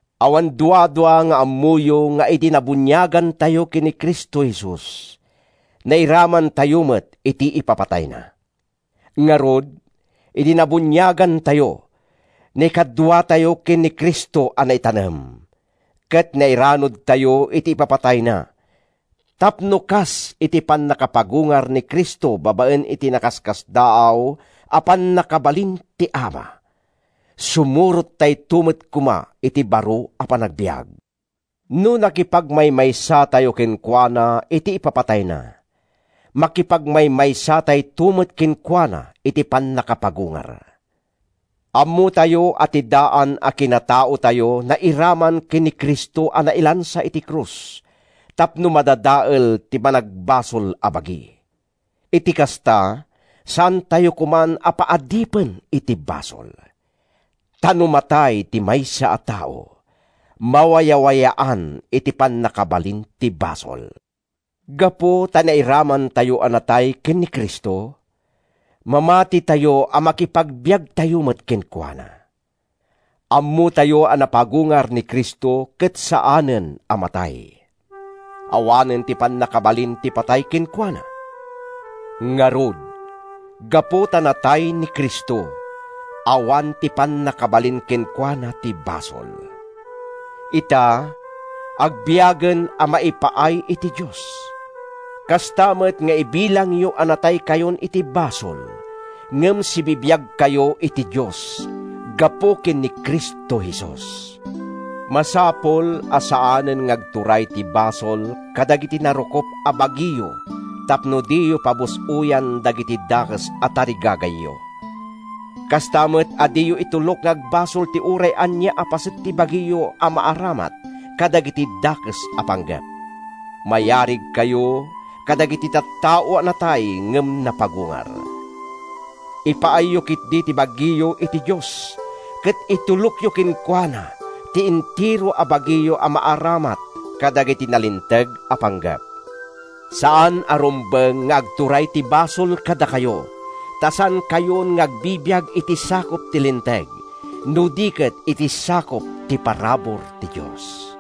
Awan duadua nga ammoyo nga idi nabuniagantayo ken ni Cristo Jesus, nairamantayo met iti ipapatayna. Ngarud, idi nabuniagantayo, naikaduatayo ken ni Cristo a naitanem, ket nairanudtayo iti ipapatayna tapno, kas iti pannakapagungar ni Cristo babaen iti nakaskasdaaw a pannakabalin ti Ama, sumurottayo met koma iti baro a panagbiag. No nakipagmaymaysatayo kenkuana iti ipapatayna, makipagmaymaysatayto met kenkuana iti pannakapagungar. Ammotayo a ti daan a kinataotayo nairaman ken ni Cristo a nailansa iti krus tapno madadael ti managbasol a bagi. Iti kasta, saantayo koman a paadipen iti basol. Ta no matay ti maysa a tao, mawayawayaan iti pannakabalin ti basol. Gapu ta nairamantayo a natay ken ni Cristo, mamatitayo a makipagbiagtayo met kenkuana. Ammotayo a napagungar ni Cristo ket saanen a matay. Awanen ti pannakabalin ti patay kenkuana. Ngarud, gapu ta natay ni Cristo, awan ti pannakabalin kenkuana ti basol. Ita, agbiagen a maipaay iti Dios. Kasta met nga ibilangyo a nataykayon iti basol ngem sibibiagkayo iti Dios, gapu ken ni Cristo Jesus. Masapul a saanen nga agturay ti basol kadagiti narukop a bagiyo tapno diyo pabus-oyan dagiti dakes a tarigagayyo. Kasta met a diyo itulok nga agbasol ti uray ania a paset ti bagiyo a maaramat kadagiti dakes a panggep. Mayarigkayo kadagiti tattao a natay ngem napagungar. Ipaayyo ketdi ti bagiyo iti Dios ket itulokyo kenkuana ti entero a bagiyo a maaramat kadagiti nalinteg a panggep. Saan a rumbeng nga agturay ti basol kadakayo ta saankayon nga agbibiag iti sakup ti linteg, no di ket iti sakup ti parabur ti Dios.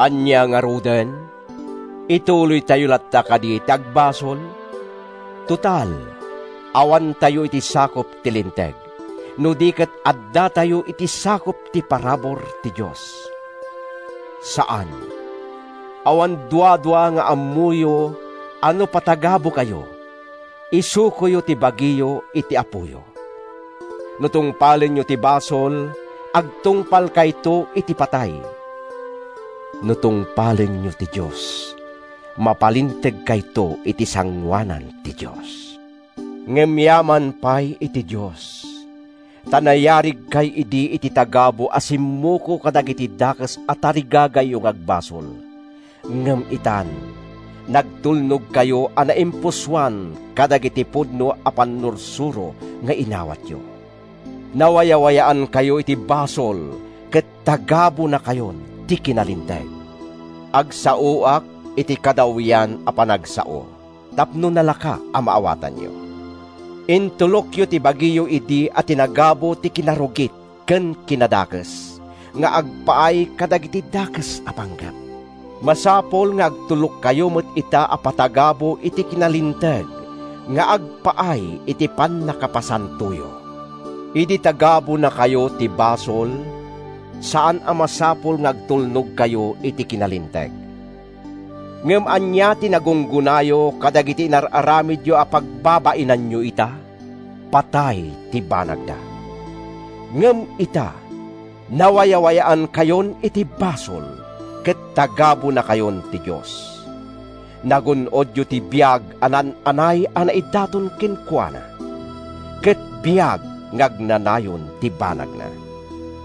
Ania ngaruden? Ituloytayo latta kadi ti agbasol? Total, awantayo iti sakup ti linteg, no di ket addatayo iti sakup ti parabur ti Dios. Saan! Awan duadua nga ammoyo a no patagabukayo, isukoyo ti bagiyo iti apoyo. No tungpalenyo ti basol, agtungpalkayto iti patay. No tungpalenyo ti Dios, mapalintegkayto iti sangoanan ti Dios. Ngem yaman pay iti Dios! Ta nayarigkay idi iti tagabu a simmuko kadagiti dakes a tarigagayyo nga agbasol ngem itan, nagtulnogkayo a naimpusoan kadagiti pudno a pannursuro nga inawatyo. Nawayawayaankayo iti basol ket tagabunakayon ti kinalinteg. Agsaoak iti kadawyan a panagsao tapno nalaka a maawatanyo. Intulokyo ti bagiyo idi a tinagabu ti kinarugit ken kinadakes nga agpaay kadagiti dakes a panggep. Masapul nga agtulokkayo met ita a patagabu iti kinalinteg nga agpaay iti pannakapasantoyo. Idi tagabunakayo ti basol, saan a masapul nga agtulnogkayo iti kinalinteg. Ngem ania ti nagunggonayo kadagiti inar-aramidyo a pagbabainanyo ita? Patay ti banagda! Ngem ita, nawayawayaankayon iti basol, ket tagabunakayon ti Dios. Nagun-odyo ti biag a naan-anay a naidaton kenkuana, ket biag nga agnanayon ti banagna.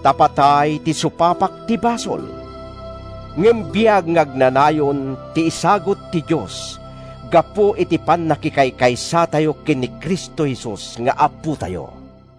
Ta patay ti supapak ti basol. Ngem biag nga agnanayon ti isagut ti Dios gapu iti pannakikaykaysatayo ken ni Cristo Jesus nga Apotayo.